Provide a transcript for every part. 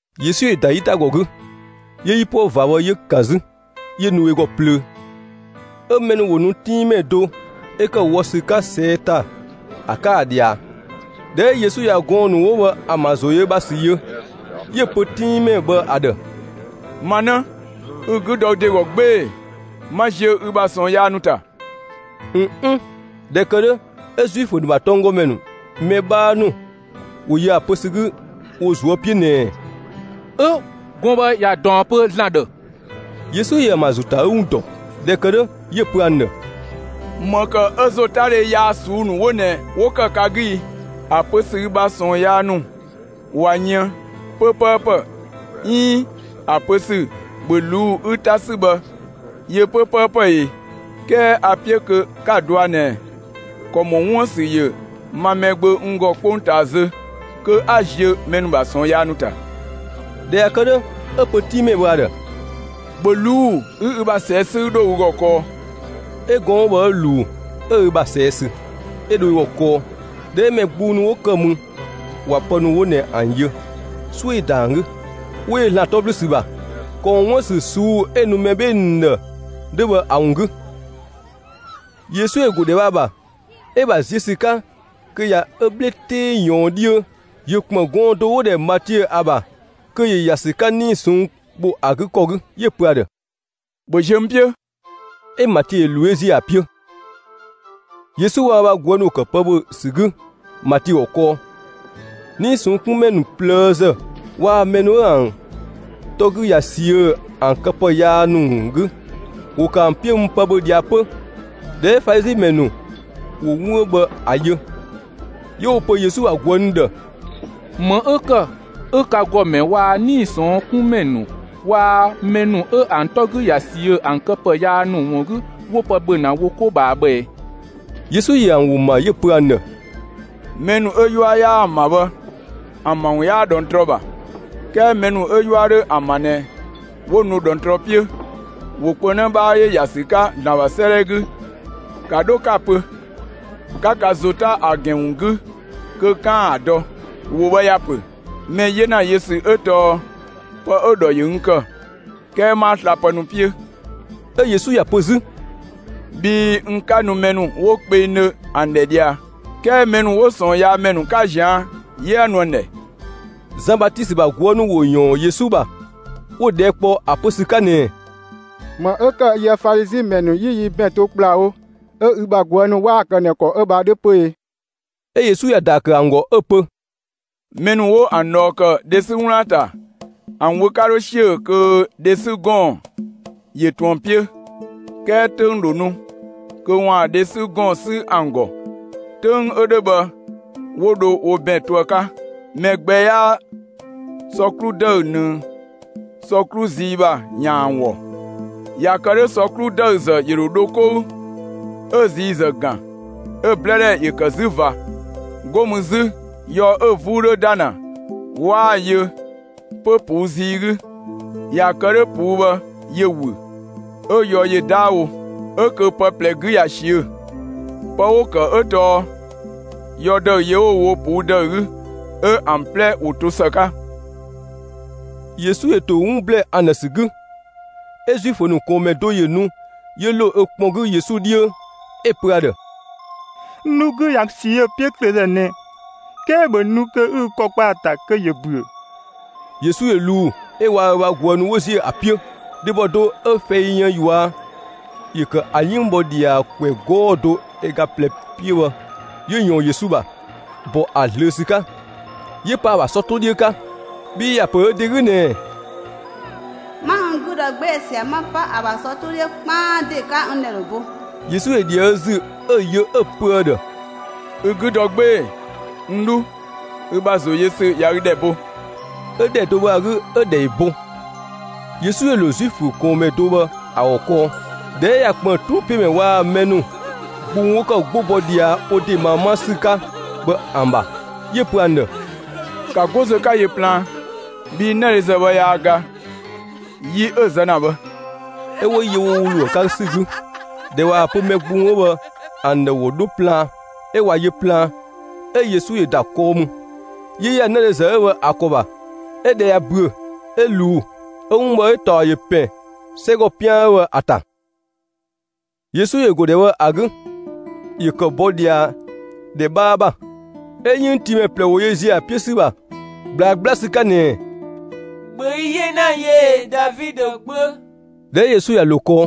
Yesu ‑yö ‑da 'yitagɔ 'gü, 'yö 'yipuë ꞊va bhë 'yö‑ ‑kan 'zü, 'yö nu ö ‑gɔ plöö. 'Ö mɛ ‑nu ‑wo nu 'tinngmɛ do 'ö ‑kë wɔ ‑sü 'ka ꞊sɛɛ' ‑ta ‑a 'ka ‑a ꞊dhia. ꞊Dhɛ 'ö Yesu ꞊ya gɔɔn‑ ‑nu 'wo bhë ‑an ‑bha ‑zo ‑yö ö ‑bha ‑sü yö, 'yö‑ pö 'tinngmɛ bhë ‑a ‑dhë: «Ma 'në, ü 'gü dɔ ü ‑de ‑gɔ 'gbee‑, 'ma ziö ü bha ꞊sɔɔn yaa ‑nu ‑ta!» ꞊N 'n, ꞊dhɛ ‑kë 'dhö, 'ö Zuifö ‑nu ‑bha tɔnggɔmɛ ‑nu mɛ 'bhaa ‑nu ‑wo yö ‑a pö ‑sü 'gü wo ꞊zuö' 'piö ꞊nɛɛ: «'Ö, gɔɔn‑ bhë ꞊ya ꞊daɔn pö ‑Zlan ‑dhë.» Yesu ‑yö ‑an ‑bha ‑zo ‑ta ‑a 'gü ‑wun ‑dɔ. ꞊Dhɛ ‑kë 'dhö, 'yö‑ pö ‑an ‑dhë: «‑Më ‑kë 'ö ‑zotadhe yaa ꞊suu'‑ ‑nu 'wo ꞊nɛ 'wo ‑kë ka 'gü i? ‑A pö ‑sü ‹ü bha ꞊sɔɔn yaa ‑nu ‑wun ꞊ya yën› 'pö 'pëëpë, 'iin ‑a pö ‑sü ‹‑bhö ꞊luu'‑ 'ü 'ta 'sü› bhë yö 'pö 'ö 'pëëpë e? 'Kɛɛ a‑ 'piö kö 'ka‑ dɔa ꞊nɛ, ‑kɔ ‑mɔ 'wuën‑ ‑sü ‑yö ma, Mɛgbö, n ‑gɔ 'kpongtaa zö kö 'a ziö mɛ ‑nu ‑bha ꞊sɔɔn yaa ‑nu ‑ta.» ꞊Dhɛ ꞊ya kë 'dhö, 'ö‑ pö 'tinngmɛ bhë ‑a ‑dhë: «‑Bhö ꞊luu'‑ 'ü ü ‑bha ꞊sɛɛ' 'sü 'ü 'dho ü ‑gɔ kɔɔ!» 'Ö gɔɔn‑ 'ö bhë 'ö ꞊luu, ('ö ö ‑bha ꞊sɛɛ' sü,) 'ö dho ö ‑gɔ kɔɔ. ꞊Dhɛ 'ö mɛ gbung ‑nu 'wo ‑kë mü ꞊wa pë ‑nu 'wo ꞊nɛ ‑an yö, 'suö ‑yö ‑da ‑an 'gü, 'wo yö ‑Zlan 'tɔ ‑blü ‑sü ‑bha, ‑kɔ ‑mɔ 'wun ‑bha ‑sü ꞊suu'‑ 'ö‑ nu mɛ 'bhee‑ ‑nu ‑dhë 'dhö bhë ‑a ‑wun 'gü. Yesu ‑yö ‑go ‑dhɛ bhë ‑a ‑bha. 'Ö‑ ‑bha ziö ‑sü 'ka, kö ꞊ya ö 'bhle 'tee ꞊yɔɔn 'dhiö, ‑yö ‑kpën gɔɔn‑ do 'wo‑ ‑dhɛ Matiö ‑a ‑bha kö ‑yö ‑ya ‑sü 'ka 'nii‑ ꞊sɔnng' ‑bho ‑a 'gü ‑kɔ 'gü, 'yö‑ pö ‑a ‑dhë: «‑Bhö ziö n 'piö!» 'ö Matiö ‑yö ꞊luu 'yö ‑ziö ‑a 'piö. Yesu waa‑ ö ‑bha ꞊guë' ‑nu ‑wo ‑kë pë ‑bhö ‑sü 'gü Matiö ‑gɔ kɔɔ. 'Nii‑ ꞊sɔnng' 'kun ‑mɛ ‑nu ꞊plëëzë waa‑ mɛ ‑nu 'ö ‑an 'tɔ 'gü ꞊ya ꞊siö' ‑an këpë yaa ‑nu ‑wun 'gü, ‑wo ‑kë ‑an 'piö mü pë ‑bhö ꞊dhia 'pö. ꞊Dhɛ 'ö Falizi ‑mɛ ‑nu ‑wo 'wun 'ö bhë ‑a yö, 'yö 'wo‑ pö Yesu ‑bha ꞊guë' ‑nu ‑dhë: «‑Më 'ö ‑kë 'ö ka ‑gɔmɛ waa‑ 'nii‑ ꞊sɔnng' 'kun ‑mɛ ‑nu waa‑ mɛ ‑nu 'ö ‑an 'tɔ 'gü ꞊ya ꞊siö'‑ ‑an këpë yaa ‑nu ‑wun 'gü, 'wo pë ‑bhö ‑na wo 'ko ꞊bhaa bhë ꞊ɛ?» Yesu ‑yö ‑an ‑wo ‑ma; 'yö‑ pö ‑an ‑dhë: «Mɛ ‑nu 'ö 'yua 'yaa ‑an ‑bha bhë, ‑an ‑bha ‑wun 'yaa ꞊dhɔngtrɔ ‑bha; 'kɛɛ mɛ ‑nu 'ö 'yua 'dho ‑an ‑bha ꞊nɛ 'wo nu ꞊dhɔngtrɔ 'piö. ‑Wo kpö 'në 'bhaa ‑yö ‑ya ‑sü 'ka ‑Zlan ‑bha 'sëëdhɛ 'gü. ‑Ka 'dho 'ka‑ pö, 'ka ka ‑zo 'ta ‑a ‑gɛn ‑wun 'gü kö 'kaan‑ ‑a dɔ. ‑Wo bhë ‑ya pö: Mɛ 'yena yö ‑sü 'ö tɔɔ pë 'ö‑ ‑dhɔ ‑yö n ‑kë. 'Kɛɛ 'maa slapë ‑nu 'piö.» 'Ö Yesu ‑ya pö 'zü: «Bhii n 'ka nu mɛ ‑nu 'wo kpengdhö ‑an ‑dhɛ ꞊dhia, 'kɛɛ mɛ ‑nu 'ö 'wo ꞊sɔɔnyaamɛ ‑nu 'ka ꞊zian' 'yö 'a nu ‑an ‑dhɛ.» Zan Batisö ‑bha ꞊guë' ‑nu ‑wo ‑yɔɔn Yesu ‑bha, 'wo‑ ꞊dhɛɛ' kpɔ ‑a pö ‑sü 'ka ꞊nɛɛ: «‑Më 'ö ‑kë 'ö yië‑ Falizi ‑mɛ ‑nu 'yi yi ‑bɛn to ‑kplawo, 'ö ü ‑bha ꞊guë' ‑nu 'waa‑ kë ꞊nɛ ‑kɔ bhë ‑a 'dhö 'pö e?» 'Ö Yesu ‑ya ‑daa ‑kë ‑an ‑gɔ 'ö‑ pö: «Mɛ ‑nu 'wo ‑an ꞊dhɔɔ ‑kë, dhe 'sü 'wlaan‑ ‑ta, ‑an wö 'ka 'dho ‑siö kö dhe 'sü ‑gɔɔn ‑yö ꞊tun ‑an 'piö. 'Kɛɛ 'töng ‑dho nu kö ‑waan dhe 'sü ‑gɔɔn 'sü ‑an ‑gɔ; 'töng 'ö 'dhö bhë 'wo dho wo ‑bɛn to ‑a 'ka. Mɛ gbɛ 'yaa sɔ 'klu ‑dëü ꞊nëng sɔ 'klu zii ‑bha ‑yaan ‑an ‑wɔ. ꞊Ya kë 'dhö, sɔ 'klu ‑dëüzë ‑yö ‑dho dho 'kou, 'ö ziizë ‑gan, 'ö 'blë ‑dhɛ ‑yö ‑kë 'zü ꞊va. 'Go mü 'zü, yɔ 'ö 'vuu dho ‑da ‑na, 'waa‑ yö 'pö ꞊puu' zii 'gü. ꞊Ya kë 'dhö 'puu bhë ‑yö ‑wü, 'ö yɔ ‑yö 'daawo. 'Ö kö pë 'plɛ 'gü ꞊ya ꞊siö'‑. Pë 'wo‑ ‑kë 'ö tɔɔ yɔ ‑dëü yö 'wo‑ wo ꞊puu' ‑dëü 'gü, 'ö ‑an 'plɛ ‑wo to ‑së 'ka.» Yesu ‑yö ‑to 'wun ‑blɛɛ ‑an ‑dhë ‑sü 'gü, 'ö Zuifö ‑nu ꞊kɔɔnmɛ do ‑yö ‑nu 'yö ‑lo ö kpɔn 'gü Yesu 'dhiö, 'ö‑ pö ‑a ‑dhë: «N 'dhu 'gü ꞊ya ꞊siö' 'piöklöözë ꞊nɛ, 'kɛɛ ‑bhö nu 'ü ü ‑kɔ kpa ‑a ‑ta kö ‑yö ‑büö.» Yesu ‑yö ꞊luu 'ö waa‑ ö bha ꞊guë' ‑nu 'wo ‑ziö ‑a 'piö. Dhebɔ do 'ö fɛi yën ꞊yua' ‑yö ‑kë ‑a 'yënng bhɔ ꞊dhia ‑kwɛ 'gɔɔ‑ do ö ga ꞊plɛ 'piö bhë ‑yö ‑yɔɔn Yesu ‑bha, ‑bɔ ‑a ꞊zlöö ‑sü 'ka, 'yö pa ‑a ‑bha sɔ 'to 'dhiö 'ka. Bhii ‑ya ‑pö ö ‑de 'gü ꞊nɛɛ: «'Ma n 'gü dɔ 'gbee‑ ꞊sia 'ma 'pa ‑a ‑bha sɔ 'to 'dhiö 'kpaan ‑de 'ka, n ‑dhɛ dho bo.» Yesu ‑yö ‑dhië ö ‑zü, 'ö‑ yö, 'ö‑ pö ‑a ‑dhë: «Ü 'gü dɔ 'gbee‑, n 'dhu! Ü ‑bha ‑zo yö ‑sü ꞊ya ü ‑dhɛ bo.» 'Ö ‑dhɛ do bhë ‑a 'gü 'ö‑ ‑dhɛ ‑yö bo. Yesu ‑yö ‑lo Zuifö ‑nu ꞊kɔɔnmɛ do bhë ‑a ‑gɔ kɔɔ. ꞊Dhɛ 'ö ꞊ya ‑kpën 'truupiömɛ ‑nu waa‑ mɛ ‑nu gbung 'wo ‑kë 'gbo bɔ ꞊dhia wo ‑de ꞊maa 'ma ‑sü 'ka bhë ‑an ‑bha, 'yö‑ pö ‑an ‑dhë: «‑Ka 'go zö 'ka yö plaan, bhii 'nëdhezë bhë yaa ga, yi 'ö‑ zë ‑na bhë.» 'Ö 'wo yö wo ‑wo ‑lo ‑a 'ka ‑sü 'gü. ꞊Dhɛ ꞊waa‑ pö mɛ gbung 'ö bhë ‑an ‑dhë ‑wo 'dho plaan, 'ö ꞊wa yö plaan, 'ö Yesu ‑yö ‑da kɔɔ mü, 'yö ‑ya 'nëdhezë 'ö bhë ‑a ‑kɔ ‑bha; 'ö ꞊dhɛ ꞊ya ‑büö, 'ö ꞊luu. 'Ö 'wun bhë 'ö‑ ‑taɔ ‑yö ‑pɛn 'sɛgɔ 'pian 'ö bhë ‑a ‑ta. Yesu ‑yö ‑go ‑dhɛ bhë ‑a 'gü. ‑Yö ‑kë bɔ ꞊dhia ‑dhɛ 'bhaa ‑bha, 'ö 'yënngtiimɛ ꞊plɛ ‑wo yö ‑ziö ‑a 'piö ‑sü ‑bha ꞊gblaa 'gbla ‑sü 'ka ꞊nɛɛ: «‑Bhö yi 'yena yö e, Davidö gbö!» ꞊Dhɛ 'ö Yesu ꞊ya ‑lo kɔɔ,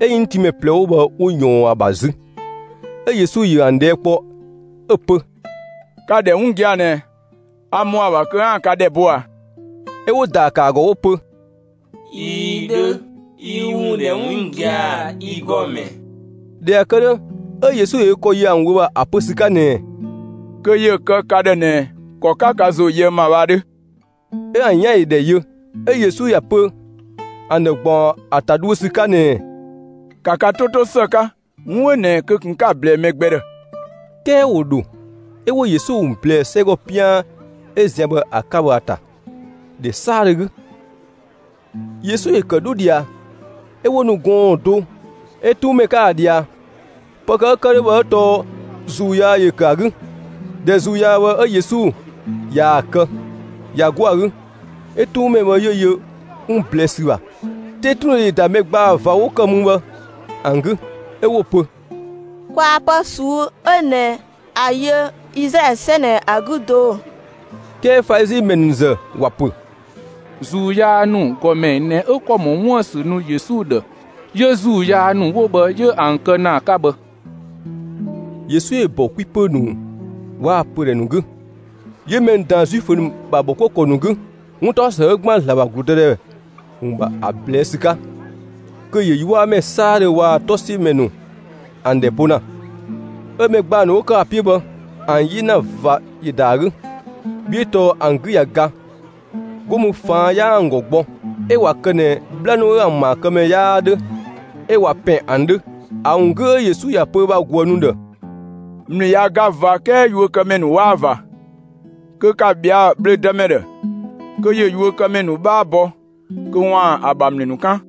'ö 'yënngtiimɛ ꞊plɛ 'wo bhë 'wo ꞊yɔɔn ‑a ‑bha 'zü; 'ö Yesu ‑yö ‑an ꞊dhɛɛ' kpɔ 'ö‑ pö: «Ka‑ ‑dhɛ 'wun gia‑ ꞊nɛ, a ‑mɔ ‑a ‑bha kö 'aan‑ ka ‑dhɛ bo ꞊a?» 'Ö 'wo‑ ‑daa ‑kë ‑a ‑gɔ 'wo‑ pö: «꞊Ii dhö, yi ü ‑wun ‑dhɛ 'wun gia‑, yi ‑Gɔmɛ.» ꞊Dhɛ ꞊ya kë 'dhö, 'ö Yesu ‑yö ö ‑kɔ yö ‑an wö ‑bha ‑a pö ‑sü 'ka ꞊nɛɛ: «Kö ‑yö kë ka ‑dhë ꞊nɛ ‑kɔ 'ö 'ka ka ‑zo yöë n ‑ma bhë ‑a 'dhö!» 'Ö ‑an 'yan ‑yö ‑dhɛ yö. 'Ö Yesu ‑ya pö ‑an ‑dhë, ‑gbaɔn ‑a ‑ta dhuö ‑sü 'ka ꞊nɛɛ: «‑Ka ka 'to 'to ‑së 'ka, 'wun 'ö ꞊nɛ kö ꞊kun 'ka‑ ꞊blɛɛ mɛ gbɛ ‑dhë!» 'Kɛɛ ‑wo ‑dho, 'ö 'wo Yesu ‑wun ꞊blɛɛ 'sɛgɔ 'pian 'ö zian bhë ‑a 'ka bhë ‑a ‑ta, ‑dhɛ 'saadhö 'gü. Yesu ‑yö ‑kë 'dho ꞊dhia, 'ö 'wo nu gɔɔn‑ do 'ö 'tuunmɛ 'ka ‑a ꞊dhia; pë ‑kë 'ö ‑kë 'dhö bhë 'ö tɔɔ ‑zuu yaa ‑yö ‑kë ‑a 'gü. ꞊Dhɛ ‑zuu yaa bhë 'ö Yesu ꞊yaa‑ kë, ꞊ya 'go ‑a 'gü, 'ö 'tuunmɛ bhë 'yö yö 'wun ꞊blɛɛ'‑ ‑sü ‑bha. 'Tetundhe ‑yö ‑da mɛ ‑gbaa ꞊va 'wo ‑kë mü bhë ‑an 'gü, 'ö 'wo‑ pö: «Kwaa pë 'ö ꞊suu'‑ 'dhö ꞊nɛ ‑a yö Izlaɛlö ‑sɛ ꞊nɛ ‑a 'gü do!» 'Kɛɛ Falizi ‑mɛ ‑nu ‑zë ‑wa ‑pö: «‑Zuu yaa ‑nu ‑gɔmɛ ꞊nɛ 'ö ‑kɔ ‑mɔ 'wun ‑bha ‑sü nu Yesu ‑dhë, 'yö ‑zuu yaa ‑nu 'wo bhë 'yö ‑an kë ‑na ‑a 'ka bhë.» Yesu ‑yö ‑bɔ 'kwi ‑pö ‑nu waa‑ pödhɛ ‑nu 'gü, 'yö mɛ ‑nu ꞊daan Zuifö ‑nu ‑bha ‑bhɔkuëkɔ ‑nu 'gü, 'wuntaɔsë 'ö ‑gban ‑Zlan ‑bha ‑gludëdhɛ ‑wun ‑bha ‑a ꞊blɛɛ'‑ ‑sü 'ka, kö ‑yö 'yuamɛ 'saadhö waa‑ 'tɔsiömɛ ‑nu ‑an ‑dhɛ bo ‑na. 'Ö mɛ ‑gbaa ‑nu 'wo ‑kë ‑a 'piö bhë, ‑an 'yena ꞊va ‑yö ‑da ‑a 'gü, bhii 'ö tɔɔ ‑an 'gü ꞊ya ga. 'Go mü ꞊faan' 'yaa ‑an 'gü gbɔ, 'ö ꞊wa kë ꞊nɛ 'bhla ‑nu 'ö ‑an ‑maakëmɛ 'yaa 'dhö 'ö ꞊wa ‑pɛn ‑an 'dhö. ‑A ‑wun 'gü 'ö Yesu ‑ya pö ö bha ꞊guë' ‑nu ‑dhë: «‑Mlü ꞊ya ga ꞊va 'kɛɛ yuökëmɛ ‑nu 'waa ꞊va; kö ‑ka ꞊bhɛa' bhlö‑ dëmɛ ‑dhë kö ‑yö yuökëmɛ ‑nu 'bhaa bɔ kö ‑waan ‑a ‑bha ‑mlü ‑nu 'kan!»